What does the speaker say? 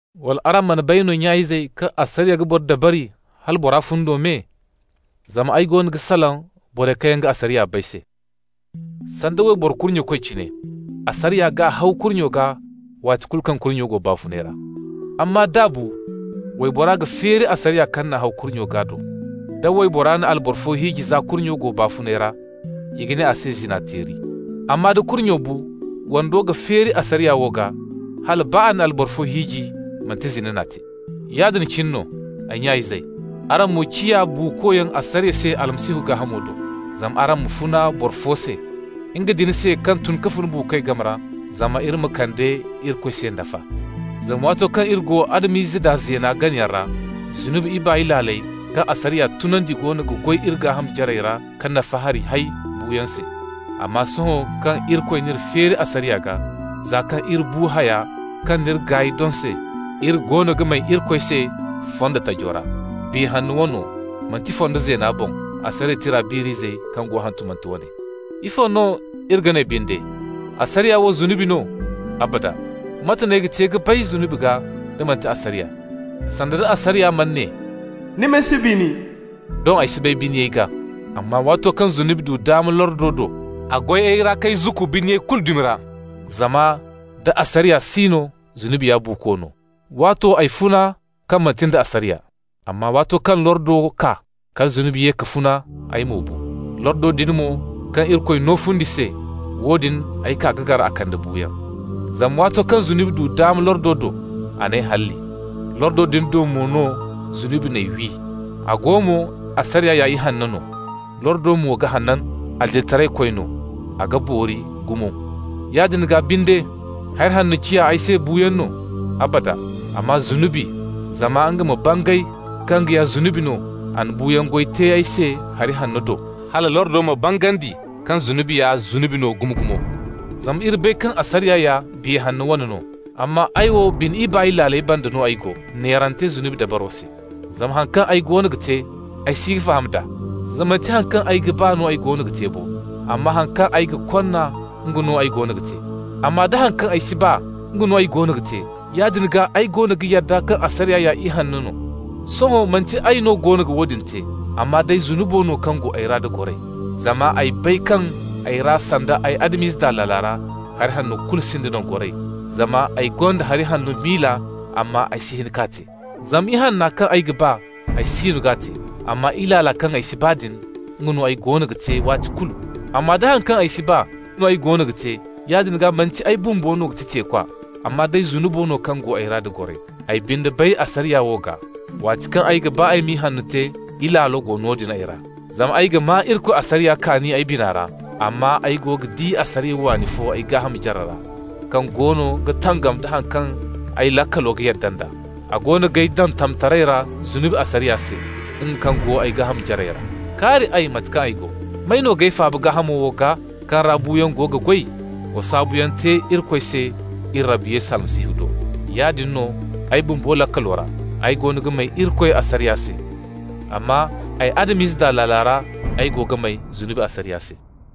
Wala araŋ mana bay no, nya-izey, kaŋ asariya ga boro dabari hala bora fundo me? Zama ay goono ga salaŋ borey kaŋ yaŋ ga asariya bay se. Sanda wayboro kurnyekoy cine, asariya g'a haw kurnyo gaa waati kulu kaŋ kurnyo go baafuney ra. Amma d'a bu, waybora ga feeri asariya kaŋ n'a haw kurnyo gaa do. Da waybora na alboro fo hiiji za kurnyo go baafuney ra, i ga ne a se zina-teeri. Amma da kurnyo bu, wando ga feeri asariya wo gaa, hala baa a na alboro fo hiiji, manti zina n'a te. Yaadin cine no, ay nya-izey, araŋ mo ciya buukoyaŋ asariya se Almasihu gaahamo do, zama araŋ ma funa boro fo se, nga din se kaŋ tun ka fun buukoy game ra, zama iri ma kande Irikoy se nafa. Zama waato kaŋ iri go Adam-ize daa zeena ganayaŋ ra, zunubi ibaay laaley, kaŋ asariya tunandi, goono ga goy iri gaaham jarey ra ka nafa hari hay buuyaŋ se. Amma sohõ kaŋ Irikoy n'iri feeri asariya gaa, za kaŋ iri bu haya kaŋ n'iri gaay doŋ se, iri goono ga may Irikoy se fondo taji ra, Biya Hanno wano, manti fondo zeena boŋ asariya tira biir'izey kaŋ go hantumante wane. Ifo no iri ga ne binde? Asariya wo zunubi no? Abada! Mate n'ay ga te ka bay zunubi gaa, da manti asariya? Sanda, da asariya mana ne: «Ni ma si bini», doŋ ay si bay biniyay gaa. Amma waato kaŋ zunubi du daama lordo do, a goy ay ra k'ay zukku biniyay kulu dumi ra. Zama nda asariya si no, zunubi ya buuko no. Waato ay funa, kaŋ manti nda asariya. Amma waato kaŋ lordo kaa, kala zunubi ye ka funa, ay mo bu. Lordo din mo, kaŋ Irikoy no fundi se, woodin ay kaa ka gar a kande buuyaŋ. Zama waato kaŋ zunubi du daama lordo do, a n'ay halli. Lordo din do mo no zunubi n'ay wi. A go mo, asariya ya ihanno no, lordo mo ga hanan, adilitaraykoy no, a ga boori gumo. Yaadin gaa binde, hari hanno ciya ay se buuyaŋ no? Abada! Amma zunubi, zama nga ma bangay kaŋ nga ya zunubi no, a na buuyaŋ goy te ay se hari hanno do, hala lordo ma bangandi kaŋ zunubi ya zunubi no gumo-gumo. Zama iri bay kaŋ asariya ya Biya Hanno wane no, amma ay wo bine ibaay laaley banda no ay go, neerante zunubi dabaro se. Zama haŋ kaŋ ay goono ga te, ay si ga faham d'a. Zama manti haŋ kaŋ ay ga ba no ay goono ga te bo, amma haŋ kaŋ ay ga konna, nga no ay goono ga te. Amma, da haŋ kaŋ ay si ba, nga no ay goono ga te, yaadin gaa ay goono ga yadda kaŋ asariya ya ihanno no. Sohõ manti ay no goono ga woodin te, amma day zunubo no kaŋ go ay ra da goray. Zama ay bay kaŋ ay ra, sanda ay Adam-ize daa laala ra, hari hanno kulu sinda nangoray, zama ay gonda hari hanno miila, amma ay si hin k'a te. Zama ihanno kaŋ ay ga ba, ay siino g'a te, amma ilaala kaŋ ay si ba din, nga no ay goono ga te waati kulu. Amma da haŋ kaŋ ay si ba no ay goono ga te, yaadin gaa manti ay bumbo no ga ti teekwa, amma day zunubo no kaŋ go ay ra da goray. Ay binde bay asariya wo gaa: waati kaŋ ay ga ba ay ma ihanno te, ilaalo go noodin ay ra. Zama ay ga maa Irikoy asariya kaani ay bina ra, amma ay go ga di asariya waani fo ay gaaham jarey ra, kaŋ goono ga tangam da haŋ kaŋ ay laakalo ga yadda nd'a. A goono g'ay daŋ tamtaray ra zunubi asariya se, nga kaŋ go ay gaaham jarey ra. Kaari ay mate kaŋ ay go! May no g'ay faaba gaahamo wo gaa, kaŋ ra buuyaŋ go ga goy? Wa saabuyaŋ te Irikoy se iri Rabbi Yesu Almasihu do! Yaadin no, ay bumbo laakalo ra, ay goono ga may Irikoy asariya se, amma ay Adam-ize daa laala ra ay go ga may zunubi asariya se.